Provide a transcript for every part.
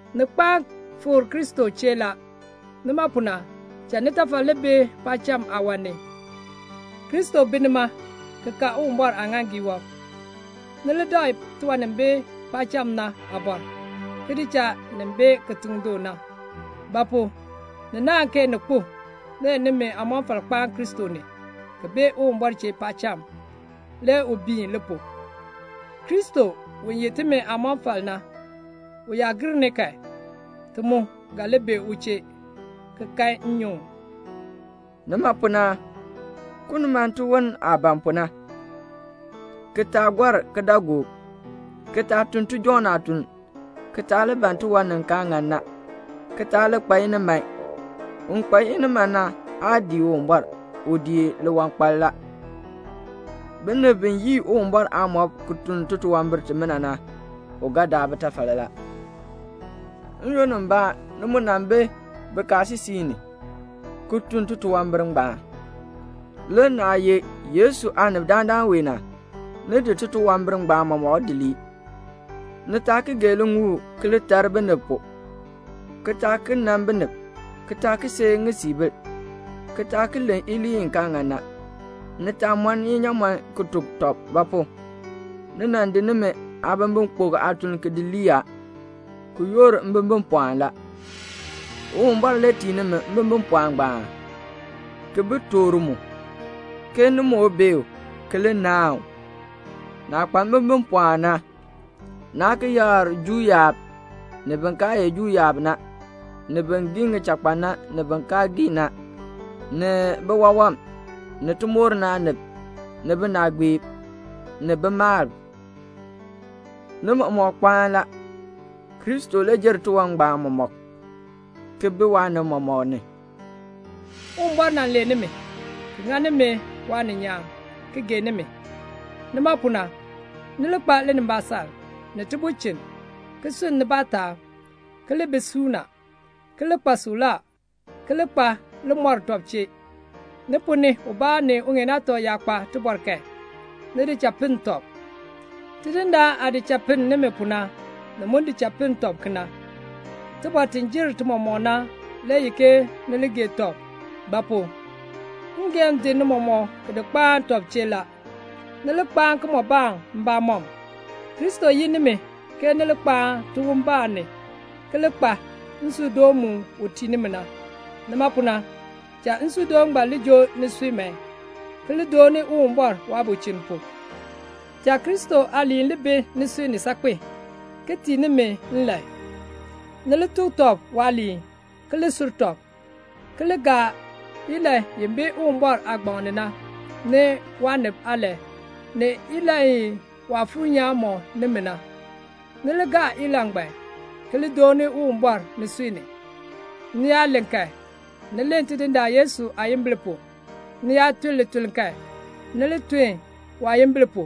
Ni kpaan fikr Kristo chee la. Nima pu na, cha nitafal li bi paacham aawan ni. Kristo bi nima ki ka Uwumbɔr aaŋaaŋgii wɔb. Ni li dakl tiwan ni bi paacham na aabɔr, ki di cha nin bi kitiŋ du na. Ba pu? ni naahn ke ni kpo; le nimi aamɔfal kpaan Kristo ni, ki bi Uwumbɔr chee paacham, le u biin li pu. Kristo, u ye timi aamɔfal na, u yaa gir ni kan, ti mu ga li bi u chee, ki kan nnyuŋ. Nima pu na, kuln man tiwon aah ban pu na, ki taa gɔr kidaagook, ki taa tun tijɔŋ aatuln, ki taa li ban tiwan ni kaa ŋan na, ki taa li kpa iniman. Un kpa iniman na aa dii Uwumbɔr, u dii liwankpal la. Binib bi yii Uwumbɔr aamɔb ki tun titunwambir timina na, u ga daa bitafal la. N-yoonn mbaa ni mu nan bi bikaasisik ni, ki tun titunwambir ngbaan. Le naah ye Yesu aanib dandana wee na, ni di titunwambir ngbaan mɔmɔk di lii. Ni taa ki gee liŋuul ki li tar binib pu, ki taa ki nan binib, ki taa ki seei ŋisiibil, ki taa ki len iliin i kaa ŋan na. Ni taa mɔn inyaamɔn ki tuk tɔb; ba pu? ni nan di nimi aabimbikpok aatuln ki di lii a, ki yoor mbimbipɔɔn la. Uwumbɔr le tii nimi mbimbipɔɔn ngbaan, ki bi toor mu, ke ni moo bee u, ki li naahn u. Naah kpa mbimbipɔɔn na, naa ki yakr Juu yaab, ni bin kaa ye Juu yaab na, ni bin gii ŋichakpan na, ni bin kaa gii na, ni biwawam, ni timoor ni aanib, ni binaagbiib, ni bimalb. Ni mɔmɔk kpaan la. Kristo le jer tiwan ngbaan mɔmɔk, ki bi waanib mɔmɔk ni. Uwumbɔr nan lee nimi, ki ŋa nimi waaninyaan, ki gee nimi. Nima pu na, ni li kpa linimbaasaln, ni tibulchin, ki sunn nibaa taab, ki li bi suuna, ki li kpa suklaa, ki li kpa limɔr tɔb chee. Ni ponn ni ubaa ni uŋeen aatɔ yaa kpa tibɔr kan, ni di cha pinn tɔb. Tidindaan aah di cha pinn nimi pu na, ni mu di cha pinn tɔb kena. Tibɔr ti jer ti mɔmɔk na le ye ke ni li gee tɔb; ba pu? ngeehn di ni mɔmɔk ki di kpaan tɔb chee la, ni li kpaa kimɔbaan mbamɔm. Kristo yin nimi ke ni li kpaan tiwonbaan ni, ki li kpa nsuudoon mu u tii nimi na. Nima pu na, cha nsuudoon ngbaan li joo nisui man, ki li dooni Uwumbɔr waabulchin pu. Cha Kristo aaliin li bi nisui ni saakpen, ki tii nimi nlan. Ni li tuk tɔb waaliin, ki li sur tɔb, ki li gaa ilahn i bi Uwumbɔr aagbaŋ ni na, ni waanib aalahn, ni ilahn i Waafuur nyaan mɔk nimi na. Ni li gaa ilahn ngbaan, ki li dooni Uwumbɔr nisui ni. Ni yaa len kan, ni len Tidindaan Yesu aayimbil pu; ni yaa tun lituln kan, ni li tun waayimbil pu,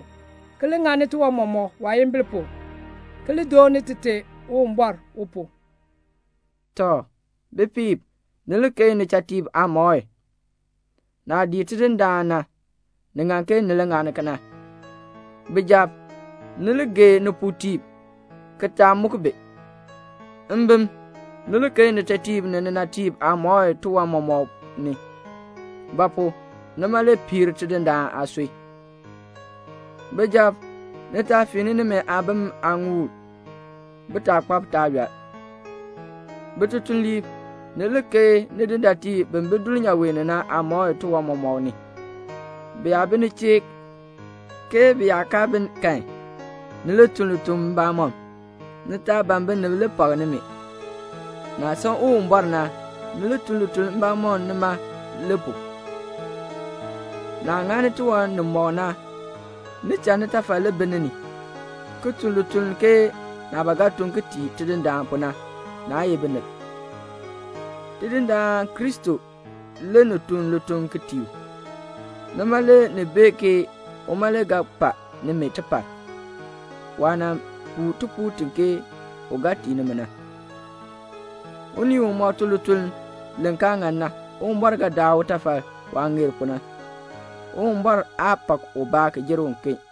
ki li ŋani tiwan mɔmɔk waayimbil pu, ki li dooni Tite Uwumbɔr u pu. Tɔ, bipiib, ni li keei nichatiib aamɔi. Naah dii Tidindaan na, ni ŋan ke ni li ŋani kena. Bijab, ni li gee nipuutiib, ki taa muk bi. Mbim, ni li keei nitetiib ni ninatiib aamɔi tiwan mɔmɔk ni; ba pu? nima le piir Tidindaan aasui. Bijab, ni taa fiin nimi aabim aaŋuul, bitaakpab taa yɔl. Bitutuliib, ni li keei nidindaatiib bi bi dulnyaa ni na aamɔi tiwan mɔmɔk ni. Bi yaa bi ni chee, ke bi yaa kaa bi kan, ni li tun lituln mbamɔm. Ni taa ban binib li pak nimi. Naah san Uwumbɔr na, ni li tun lituln mbamɔm nima le pu. Naah ŋani tiwan nimɔk na, ni cha nitafal li bi ni ni, ki tun lituln ke naah ba ga tun ki tii Tidindaan pu na, naa ye binib. Tidindaan Kristo le ni tun lituln ki tii u. Nima le ni bee ke uma le ga pa nimi tipar, waah nan puu tipuul ti ke u ga tii nimi na. Unii umɔk tun lituln li kaa ŋan na, Uwumbɔr ga daa utafal waah ŋeer pu na. Uwumbɔr aa pak ubaa ki jer uken.